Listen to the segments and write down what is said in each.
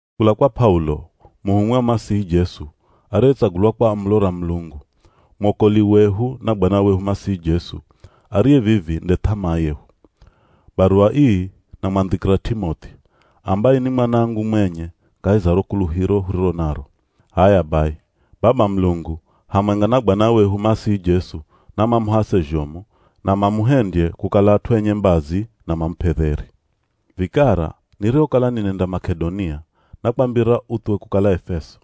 Kula kwa P'aulo, muhumwi wa Masihi Jesu ariyetsagulwa kwa amulo ra Mulungu, mwokoli wehu na Bwana wehu Masihi Jesu, ariye vivi nde th'amaa yehu. Baruwa ii namwandhikira T'imoth'i, ambaye ni mwanangu mwenye kahi za ro kuluhiro huriro naro. H'aya bai, Baba Mulungu hamwenga na Bwana wehu Masihi Jesu namamuhase zhomu, na mamuhendye kukala at'u enye mbazi na mamup'e dheri. Vikara nirihokala ninenda Mak'edonia nakwambira uthuwe kukala Efeso.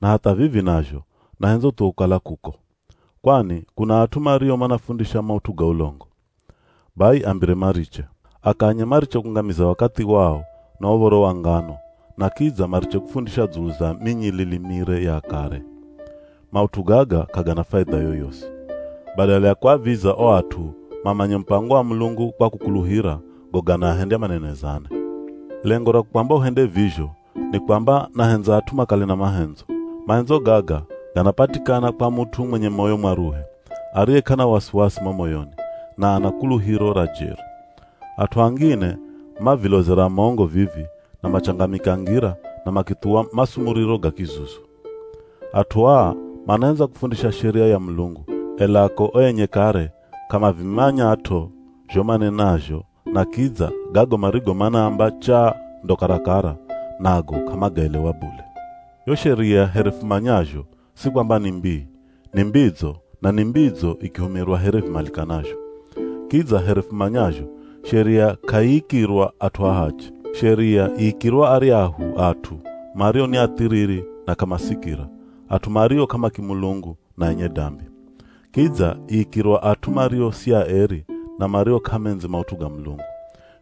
Na hatha vivi nazho nahendza uthuwe kukala kuko. Kwani kuna at'u mario manafundisha maut'u ga ulongo. Bai ambire mariche. Akanye mariche kungamiza wakathi wao na uv̱oro wa ngano na kidza mariche kufundisha dzulu za minyilili mire ya akare. Maut'u gaga k'agana faidha yoyosi. Badala ya kuaviza o at'u mamanye mupango wa Mulungu kwa kukuluhira, go ganaahendya manenezane. Lengo ra kukwamba uhende vizho ni kwamba nahendza at'u makale na mahendzo. Mahendzo gaga ganapatikana kwa mut'u mwenye moyo mwaruhe, ariye k'ana wasiwasi mo moyoni, na ana kuluhiro ra jeri. At'u angine mavilozera mongo vivi na machangamika ngira na makithuwa masumuriro ga kizuzu. At'u aa manahendza kufundisha sheria ya Mulungu, ela ko o enye kare k'amavimanyat'o zho manenazho na kidza gago marigo manaamba chaa ndo karakara, nago k'amagaelewa bule. Yo sheria here fumanyazho si kwamba ni mbii, ni mbidzo na ni mbidzo ikihumirwa here vimalikanazho. Kidza here fumanyazho sheria k'aiikirwa at'u ahachi. Sheria iikirwa aryahu at'u mario ni athiriri na k'amasikira, at'u mario k'amakimulungu na enye dambi. Kidza iikirwa at'u mario si aeri na mario k'amendzi maut'u ga Mulungu.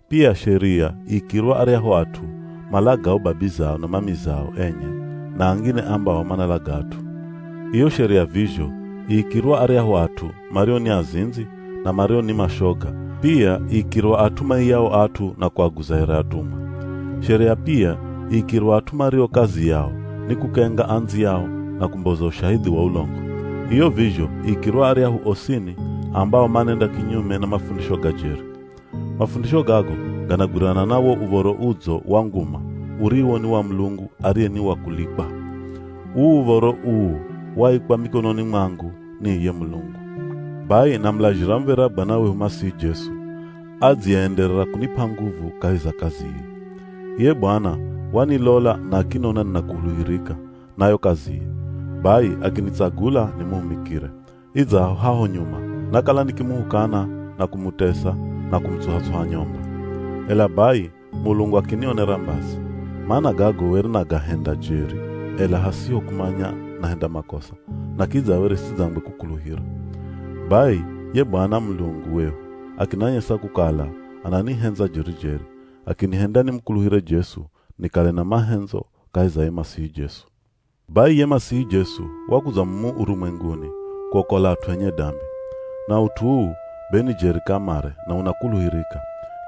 Pia sheria iikirwa aryahu at'u malagao babizao na mamizao enye na angine ambao manalaga at'u. Iyo sheria vizho iikirwa aryahu at'u mario ni azindzi, na mario ni mashoga, pia iikirwa at'u maiyao at'u na kuaguza here atumwa. Sheria pia iikirwa at'u mario kazi yao ni kukenga andziyao na kumboza ushahidhi wa ulongo, iyo vizho iikirwa aryahu osini ambao manenda kinyume na mafundisho ga jeri. Mafundisho gago ganagwirana na wo Uv̱oro Udzo wa nguma uriwo ni wa Mulungu ariye ni wa kulikwa. Uu uv̱oro uu waikwa mikononi mwangu ni iye Mulungu. Bai namulazhira muv̱era Bwana wehu Masihi Jesu, adziyeenderera kunip'a nguvu kahi za kazi ii. Iye Bwana wanilola na akinona ninakuluhirika na yo kaziye, bai akinitsagula nimuhumikire, Idzaho haho nyuma nakala nikimuhukana na kumutesa na kumutsuha-tsuha nyomba. Ela bai Mulungu akinionera mbazi, mana gago were nagahenda jeri, ela hasiho kumanya nahenda makosa na kidza were sidzangwe kukuluhira. Bai ye Bwana Mulungu wehu akinanyesa kukala ananihendza jeri-jeri, akinihenda nimukuluhire Jesu nikale na mahendzo kahi za ye Masihi Jesu. Bai ye Masihi Jesu wakudza mumu urumwenguni kuokola at'u enye dambi. Na ut'u uu be ni jeri kamare na unakuluhirika,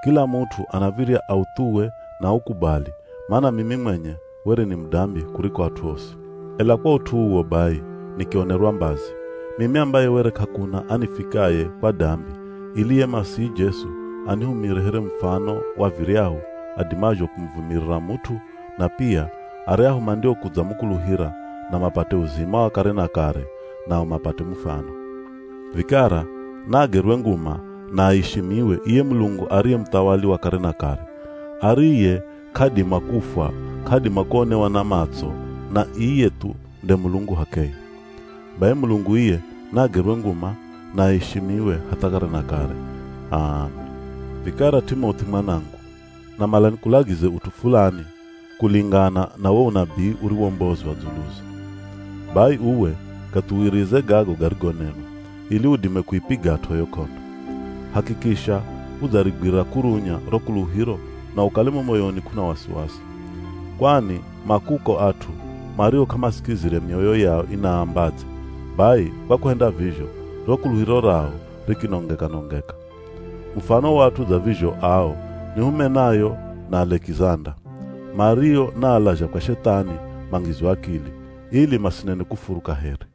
kila mut'u anav̱irya authuwe na aukubali mana mimi mwenye were ni mudambi kuriko at'u osi. Ela kwa ut'u uwo bai nikionerwa mbazi, mimi ambaye were k'akuna anifikaye kwa dambi ili ye Masihi Jesu anihumire here mufano wa viryahu adimazho kumuvumirira mut'u, na pia aryahu mandiokudzamukuluhira na mapate uzima wa kare na kare, nao mapate mufano. Vikara naagerwe nguma na aishimiwe iye Mulungu ariye muthawali wa kare na kare, ariye k'adima kufwa, k'adima kuonewa na matso na iye thu nde Mulungu h'akeye. Bai Mulungu iye naagerwe nguma na aishimiwe hatha kare na kare! H'aami. Vikara T'imoth'i mwanangu, namala nikulagize ut'u fulani kulingana na wo unabii uriwombozwa dzuluzo. Bai uwe gathuwirize gago garigonenwa, ili udime kuipigat'o yo k'ondo. Hakikisha udzarigwira kurunya ro kuluhiro na ukale mo moyoni k'una wasiwasi. Kwani ma kuko at'u mario k'amasikizire mioyo yao inaambadze, bai kwa kuhenda vizho, ro kuluhiro rao rikinongeka-nongeka. Mufano wa at'u dza vizho ao ni Humenayo na Alekizanda, mario naalazha kwa Shethani mangizwe akili, ili masinene kufuru kaheri.